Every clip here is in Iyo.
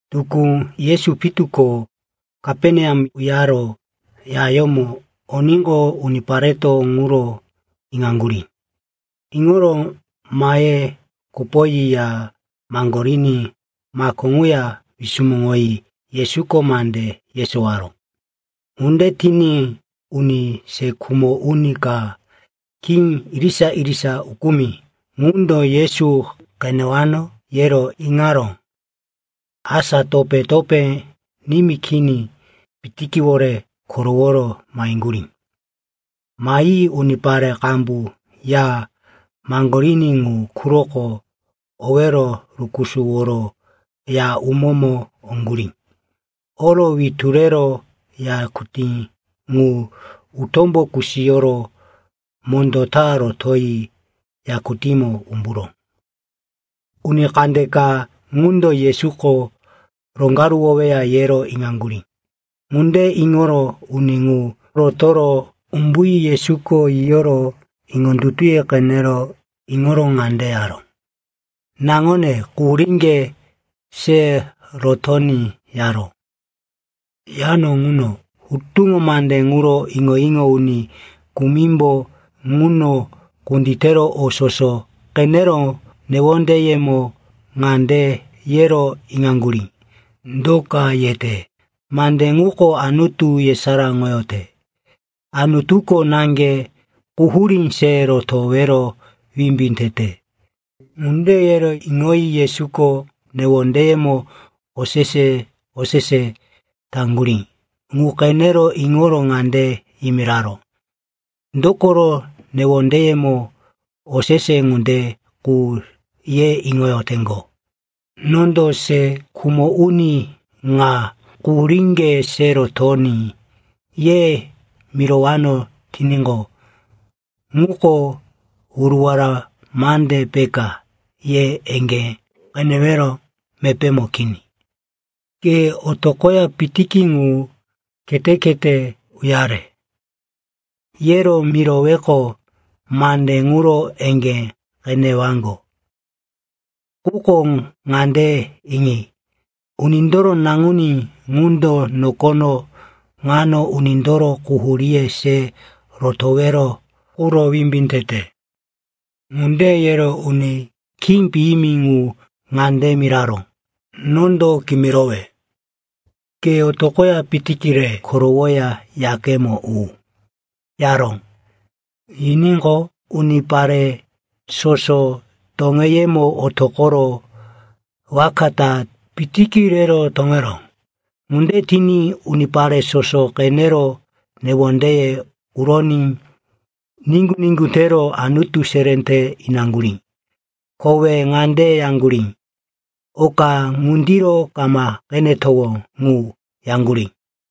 Tukú, Yesu pitu ko Kaperneam uyaro yayómo oníqo, unipareto ŋuro iŋaŋgurí. Iŋoro mahe kopoyi ya maŋgoriní mako ŋuya wisumuŋoyi Yesuko mande yesowaró. Ŋunde tiní uni se khumo uni ka, khí irisa-irisa ukumi, ŋundo Yesu qenewano, yero iŋaró. Asa topé-topé nimí kini pitikiwore koroworo maheŋgurí. Mahi unipare qambu ya maŋgoriní ŋu quroko owero rukusuworo ya umómo oŋgurí. Oro witu rero yakutí ŋu utómbo kusiyoro mondó ta rotoyi yakutímo umburó. Uni kandeka ŋundo Yesuko roŋgaruwoweya, yero iŋaŋgurí. Ŋunde iŋoro uni ŋu rotoro umbuyi Yesuko yiyoro iŋondutuye qene iŋoro ŋande yaró, “Naŋone, quhuríŋge se rotoní,” yaró. Yano ŋuno hutuŋo mande ŋuro iŋo-iŋo uni kumimbo ŋuno kunditero o soso qenero newondeyemo ŋande yero iŋaŋgurí, “Do ka yete? Mande ŋuko Anutu yesaráŋoyote. Anutuko naŋge quhurí se rotowero wimbí tete.” Ŋunde yero iŋoyi Yesuko newondeyemo osese-osese taŋgurí ŋu qene iŋoro ŋande yimiraró, “Dokoro newondeyemo osese ŋunde qu ye iŋoyoteŋgo? Nondo se khumo uni ŋa, ‘Quhuríŋge se rotoní,’ ye mirowano tiníqo, ŋuko wuruwara mande peka, ye eŋgé qenewero mepémo kini. Quko, ‘Ke otoqoya pitiki ŋu khete-khete uyare,’ yero miroweqo, mande ŋuro eŋgé qenewaŋgo. Quko ŋande iŋi. Unindoro Naŋuní ŋundo nokono ŋano unindoro quhuríye se rotowero quro wimbí tete.” Ŋunde yero uni khí piyimi ŋu ŋande miraró, “Nondo kimirowe, ke otoqoya pitiki re korowoya yakemo u,” yaró. Yiníqo, unipare soso toŋeyemo otoqoro waka ta pitiki rero toŋeró. Ŋunde tiní unipare soso qenero newondeye uroní niŋgu-niŋgu tero Anutu seré te inaŋgurí. Kowe ŋande yaŋgurí, “Oka ŋundiro kama qenetowó ŋu,” yaŋgurí.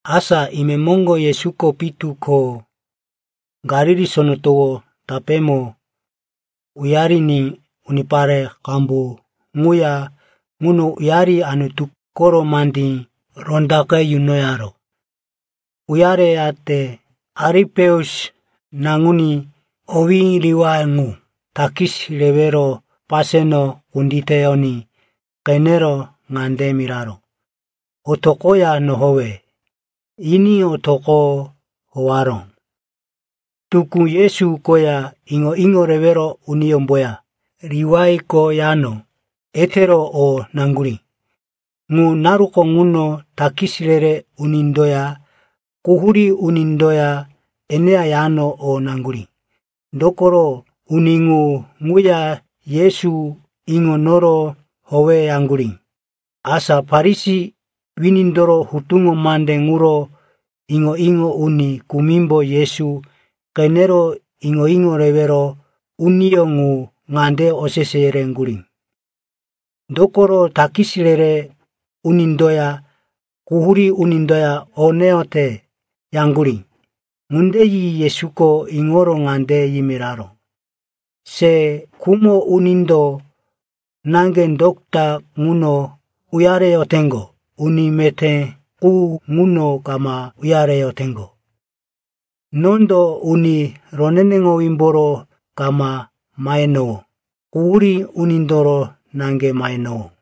Asa imemoŋgo Yesuko pitu ko Galili Sono Towo tapémo uyariní unipare qambu ŋuya ŋuno uyari Anutu koro mandí rondaqe yunoyaró. Uyareyate, Alipeus naŋuní, owí Liwai, ŋu takis rewero paseno kunditiní qenero ŋande miraró, “Otoqoya nohowe,” yiní otoqo howaró. Tukú Yesu koya iŋo-iŋo rewero uniyómboya Liwaiko yano etero o naŋgurí. Ŋu naruko ŋuno takis re-re unindoya quhurí unindoya eneya yano o naŋgurí. Dokoro uni ŋu ŋuya Yesu iŋo inoro howeyaŋgurí. Asa Farisi winindoro hutuŋo mande ŋuro iŋo-iŋo uni kumimbo Yesu qenero iŋo-iŋo rewero uniyó ŋu ŋande osese yereŋgurí, “Dokoro takis re-re unindoya quhurí unindoya o neyote?” yaŋgurí. Ŋunde yi Yesuko iŋoro ŋande yimiraró, “Se khumo unindo naŋge dota ŋuno uyareyoteŋgo. Uni meté qu ŋuno kama uyareyoteŋgo. Nondo uni roneneŋowímboro kama mahenowó. Quhurí unindoro naŋge mahenowó.”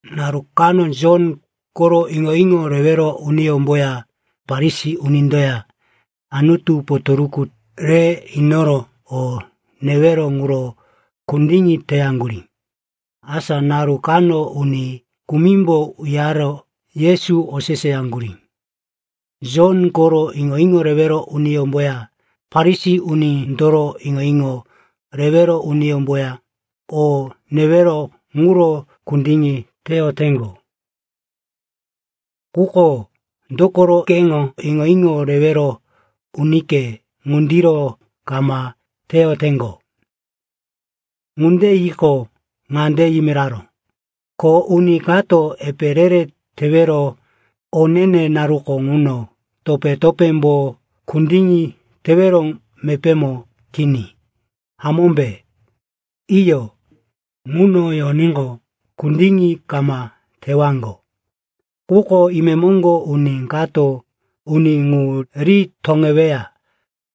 Naru kano Jon koro iŋo-iŋo rewero uniyómboya Farisi unindoya Anutu potoruku re inoro o newero ŋuro kundiŋi teyaŋgurí. Asa naru kano uni kumimbo uyaro Yesu oseseyaŋgurí, “Jon koro iŋo-iŋo rewero uniyómboya Farisi unindoro iŋo-iŋo rewero uniyemboya o newero ŋuro kundiŋi teyoteŋgo. Quko dokoro keŋo iŋo-iŋo rewero unike ŋundiro kama teyoteŋgo?” Ŋunde yiqo, ŋande yimiraró, “Ko uni kato epe re-re tewero o ne-ne naruko ŋuno topé-topémbo kundiŋi tewero mepémo kini, hamómbe? Iyo, ŋuno yoníqo, kundiŋi kama tewaŋgo. Quko imemoŋgo uni kato uni ŋu ri toŋeweya.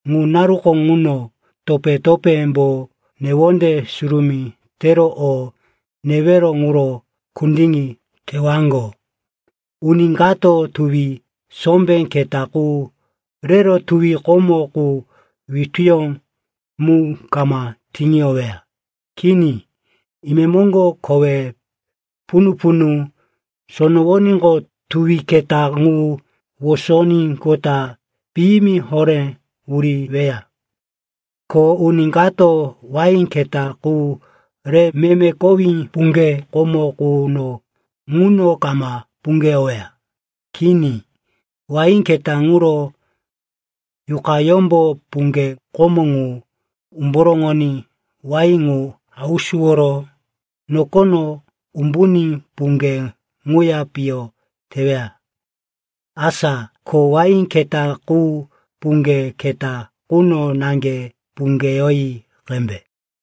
Ŋu naruko ŋuno topé-topémbo newonde surumí tero o newero ŋuro kundiŋi tewaŋgo. “Uni kato tuwi sombé keta qu rero tuwi komo qu wituyó mu kama tiŋiyoweya. Kini. Imemoŋgo kowe punu-punu sonowoníqo, tuwi keta ŋu wosoníqota piyimi horé wuriweya. Ko uni kato wain keta qu re meme kowí puŋge komo quno ŋuno kama puŋgeyoweya. Kini, wain keta ŋuro yuqayómbo puŋge komo ŋu umboroŋoní wain ŋu hausuworo nokono umbuní puŋge ŋuya piyo teweya. Asa ko wain keta qu puŋge keta quno naŋge puŋgeyoyi qembe.”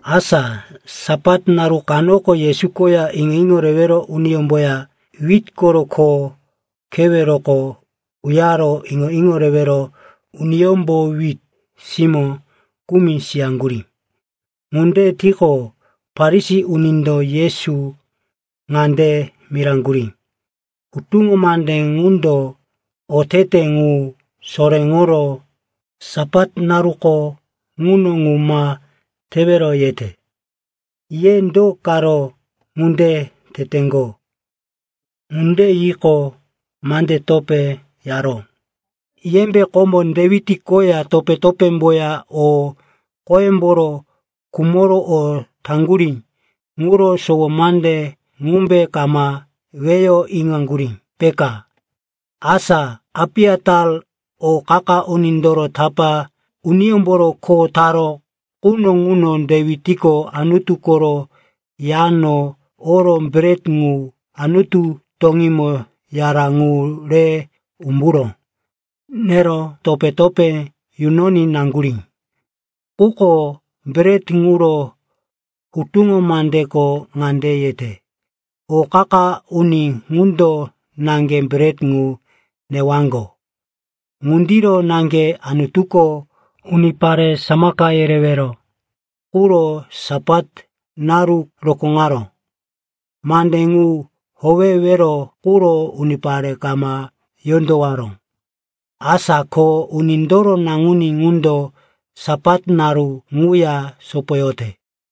Asa Sapat naru kanoko Yesu koya iŋo-iŋo rewero uniyómboya wit koro kho keweroko uyaro iŋo-iŋo rewero uniyómbo wit simó kumi siyaŋgurí. Ŋunde tiqo, Farisi unindo Yesu ŋande miraŋgurí, “Hutuŋo mande ŋundo otete ŋu soréŋoro, Sapat naruko ŋuno ŋu ma tewero, yete. Ye do karo ŋunde teteŋgo?” Ŋunde yiqo, mande topé yaró, “Yembe komo Dewit koya topé-topémboya o qoyemboro khumoro o taŋgurí ŋuro sowo mande ŋumbe kama weyo iŋaŋgurí, peka? Asa Apiatar o qa-qa unindoro tapá uniyómboro kho taró quno ŋuno Dewitko Anutu koro yano oro bret ŋu Anutu toŋímo yara ŋu re umburo nero topé-topé yunoní naŋgurí. Quko bret ŋuro, hutuŋo mandeko ŋande yete, o qa-qa uni ŋundo naŋge bret ŋu newaŋgo.” “Ŋundiro naŋge Anutuko unipare samaka yerewero quro Sapat naru rokóŋaró. Mande ŋu howewero quro unipare kama yondowaró. Asa ko Unindoro Naŋuní ŋundo Sapat naru ŋuya sopoyote.”